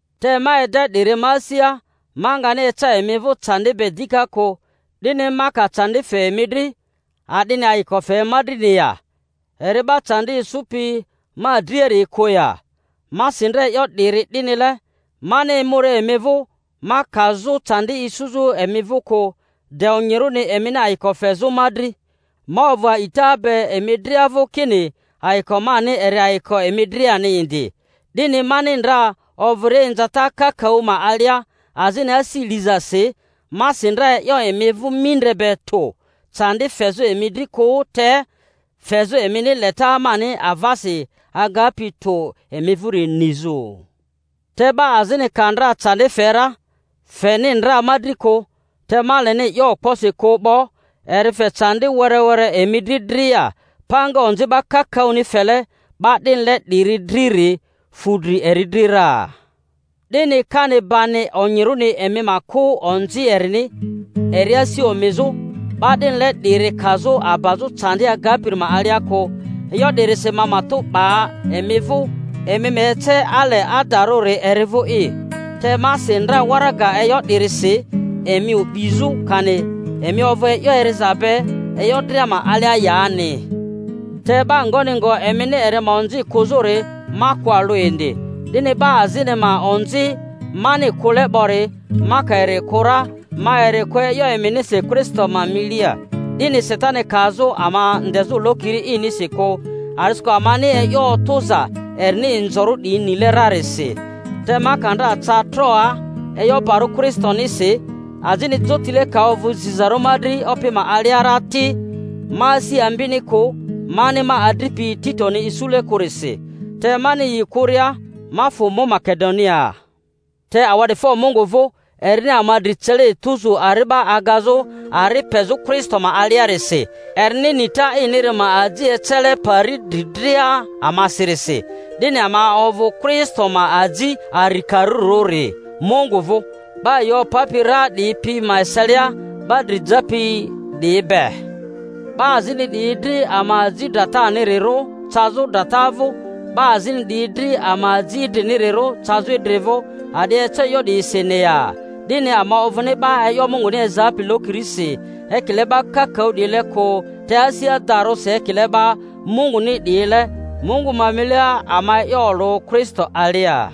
Te ma ede 'diri ma asia, ma ngani eca emi vᴜ candi be dika kᴜ. 'Dini ma ka candi fe emi dri, a'dini ayiko fe ma drini ya? Eri 'ba candi isupi ma driari'i kᴜ ya? Ma si ndra e'yo 'diri 'dinile, mani emuria emi vᴜ ma kazᴜ candi isuzᴜ emi vᴜ kᴜ, de onyirᴜni emini ayiko fezᴜ ma dri; ma ovᴜ a'ita be emi dria vᴜ kini ayiko mani eri ayiko emi driani indi. 'Dini mani ndra ovᴜria inzata kakaᴜ ma alia azini asi lizasi, ma si ndra e'yo emi vᴜ mindre be tᴜ, candi fezᴜ emi dri kᴜ, te fezᴜ emini leta mani avasi agapi tᴜ emi vᴜri nizᴜ. Te 'ba azini ka ndra candi fe ra, feni ndra ma dri kᴜ—te ma leni 'yo okposi kᴜ 'bo—eri fe candi were were emi dri dria. Panga onzi 'ba kakaᴜni fele 'ba 'dinile 'diri driri fu dri eri dri ra; 'dini kani bani onyirᴜni emi ma kᴜ onzi erini, eri asi omizᴜ, 'ba 'dinile 'diri kazᴜ abazᴜ candi agapiri ma alia kᴜ. E'yo 'dirisi ma matᴜ 'ba emi vᴜ emi ma ece ale adarᴜri eri vᴜ'i. Te ma si ndra waraga e'yo 'dirisi, emi o'bizᴜ, kani emi ovᴜ e'yo eriza be e'yo dria ma alia yani. Te 'ba ngoni ngo emini eri ma onzi kᴜzᴜri, ma kᴜ alᴜ indi. 'Dini 'ba azini ma onzi mani kᴜle 'bori, ma ka eri kᴜ ra, ma eri kᴜ e'yo eminisi Kristo ma milia, 'dini Satani kazᴜ ama ndezᴜ lokiri inisi kᴜ; a'disikᴜ amani e'yo otᴜza erini inzorᴜ 'diyi nile rarisi. Te ma ka ndra ca Troaa e'yo barᴜ Kristonisi, azini jotile ka ovᴜ zizarᴜ ma dri Opi ma alia ra ti, ma asi ambini kᴜ mani ma adripi Titoni isule kᴜrisi. Te mani yi kᴜria, ma fᴜ mu Makedoniaa. Te awa'difo Mungu vᴜ, erini ama dri cele etuzu ari'ba agazᴜ ari pezᴜ Kristo ma aliarisi, erini nita iniri ma aji ecele pari dri dria amasirisi. 'Dini ama ovᴜ Kristo ma aji arikarirᴜri Mungu vᴜ, 'ba yi opapi ra 'diyi pi ma eselia 'ba dri japi 'diyi be; 'ba azini 'diyi dri ama aji dratanirirᴜ cazᴜ drata vᴜ, 'ba azini 'diyi dri ama aji idrinirirᴜ cazᴜ idri vᴜ. A'di eco e'yo 'diyisini ya? 'Dini ama ovᴜni 'ba e'yo Munguni ezapi lokirisi ekile 'ba kakaᴜ 'diyile kᴜ; te asi adarᴜsi, ekile 'ba Munguni 'diyile, Mungu ma milia ama e'yo olᴜ Kristo alia.